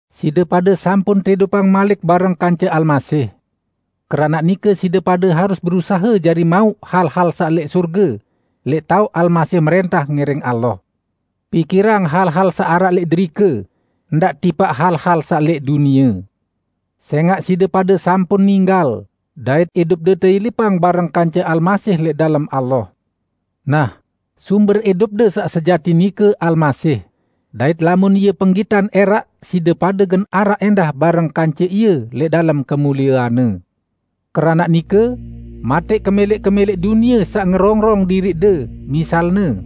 Side pade sampun teidupang malik bareng kance Almasih. Keranaq nike side pade harus berusahe jari mauq hal-hal saq lẽq sorge, lẽq taoq Almasih mrẽntah ngiring Allah. Pikirang hal-hal saq araq lẽq derike, ndaq tipaq hal-hal saq lẽq dunie. Sẽngaq side pade sampun ninggal, dait idupde teilipang bareng kance Almasih lẽq dalem Allah. Nah, sumber idupde saq sejati nike Almasih, dait lamun Ie penggitan ẽraq side pade gen araq ẽndah bareng kance Ie lẽq dalem kemuliean-Ne! Keranaq nike, matẽq kemẽlẽq-kemẽlẽq dunie saq ngerongrong diriqde, misalne: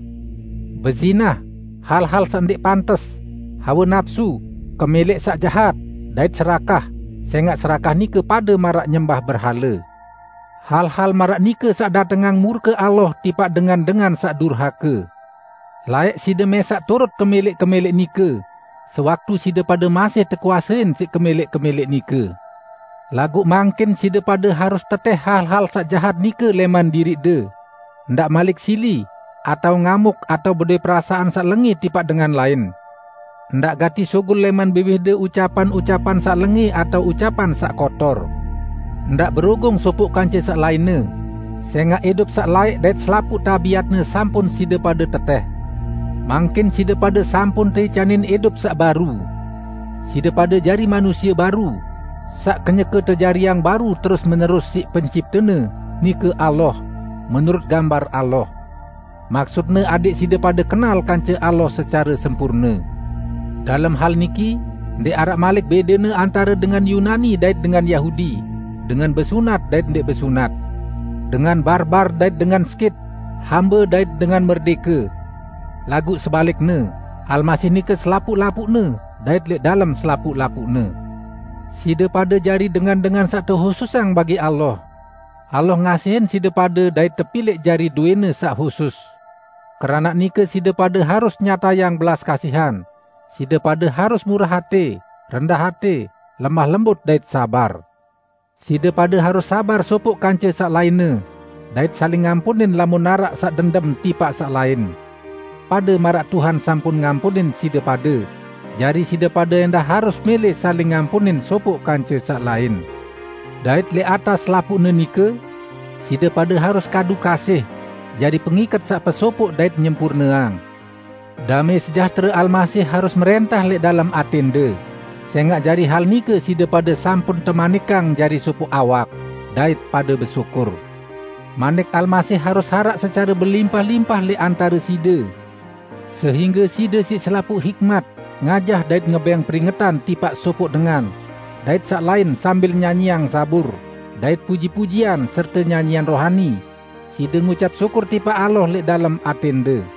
bezinah, hal-hal saq ndẽq pantes, hawe napsu, kemẽlẽq saq jahat, dait serakah (sẽngaq serakah nike pade maraq nyembah berhale). Hal-hal maraq nike saq datengang murke Allah tipaq dengan-dengan saq durhake. Laẽq side mẽsaq turut kemẽlẽq-kemẽlẽq nike, sewaktu side pade masih tekuasein siq kemẽlẽq-kemẽlẽq nike. Laguq mangkin side pade harus tetẽh hal-hal saq jahat nike lẽman diriqde: ndaq malik sili, atao ngamuk atao bedowẽ perasaan saq lengẽ tipaq dengan lain. Ndaq gati sugul lẽman biwihde ucapan-ucapan saq lengẽ atao ucapan saq kotor. Ndaq berugung sopoq kance saq lainne, sẽngaq idup saq laẽq dait selapuq tabiatne sampun side pade tetẽh. Mangkin side pade sampun teicanin idup saq baru. Side pade jari manusie baru, saq kenyeke tejariang baru terus-menerus siq penciptene, nike Allah, menurut gambar Allah. Maksutne adẽq side pade kenal kance Allah secare sempurne. Dalem hal niki, ndẽq araq malik bẽdene antare dengan Yunani dait dengan Yahudi, dengan besunat dait ndẽq besunat, dengan Barbar dait dengan Skit, hambe dait dengan merdẽke. Laguq sebalikne, Almasih nike selapuq-lapuqne dait lẽq dalem selapuq-lapuqne. Side pade jari dengan-dengan saq tehususang bagi Allah. Allah ngasihin side pade dait tepilẽq jari dowẽ-Ne saq husus. Keranaq nike side pade harus nyatayang belas kasihan, side pade harus murah atẽ, rendah atẽ, lemah lembut dait sabar. Side pade harus sabar sopoq kance saq lainne, dait saling ngampunin lamun araq saq dendem tipaq saq lain. Pade maraq Tuhan sampun ngampunin side pade, jari side pade ẽndah harus mẽlẽ saling ngampunin sopoq kance saq lain. Dait lẽq atas selapuqne nike: Side pade harus kadu kasih, jari pengiket saq pesopoq dait nyempurneang. Damẽ sejahtere Almasih harus mrẽntah lẽq dalem atẽnde, sẽngaq jari hal nike side pade sampun temanikang jari sopoq awak. Dait pade besyukur. Manik Almasih harus araq secare belimpah-limpah lẽq antare side, sehingge side siq selapuq hikmat ngajah dait ngebẽng peringetan tipaq sopoq dengan dait saq lain sambil nyanyiang zabur, dait puji-pujian serte nyanyian rohani, side ngucap syukur tipaq Allah lẽq dalem atẽnde.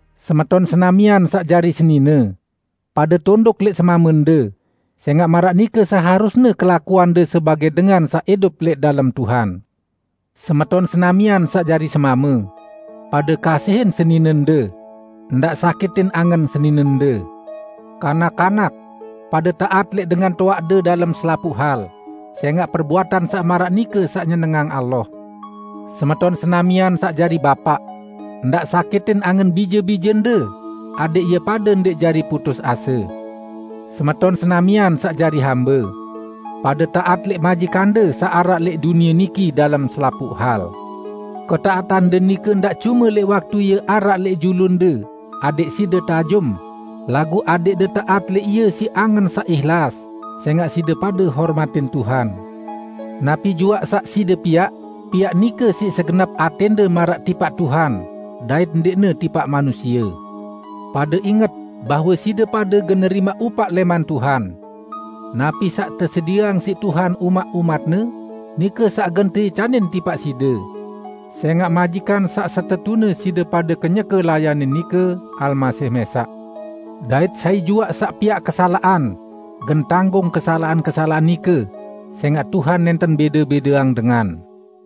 Semeton senamian saq jari senine! Pade tunduk lẽq semamende, sẽngaq maraq nike seharusne kelakuande sebagẽ dengan saq idup lẽq dalem Tuhan. Semeton senamian saq jari semame! Pade kasihin seninende. Ndaq sakitin angen seninende. Kanak-kanak! Pade taat lẽq dengan toaqde dalem selapuq hal, sẽngaq perbuatan saq maraq nike saq nyenengang Allah. Semeton senamian saq jari bapaq! Ndaq sakitin angen bije-bijende adẽq ie pade ndẽq jari putus ase. Semeton senamian saq jari hambe! Pade taat lẽq majikande saq araq lẽq dunie niki dalem selapuq hal. Ketaatande nike ndaq cume lẽq waktu ie araq lẽq julunde adẽq side teajum, laguq adẽqde taat lẽq ie siq angen saq ihlas, sẽngaq side pade hormatin Tuhan. Napi juaq saq side piaq, piaq nike siq segenep atẽnde maraq tipaq TUHAN, dait ndẽqne tipaq manusie. Pade inget bahwe side pade gen nerimaq upaq lẽman Tuhan. Napi saq tesedieang siq Tuhan umaq umat-Ne, nike saq gen teicanin tipaq side. Sẽngaq majikan saq setetune side pade kenyeke layanin nike, Almasih mẽsaq. Dait sai juaq saq piaq kesalaqan, gen tanggung kesalaqan-kesalaqan nike; sẽngaq Tuhan nẽnten bẽde-bẽdeang dengan.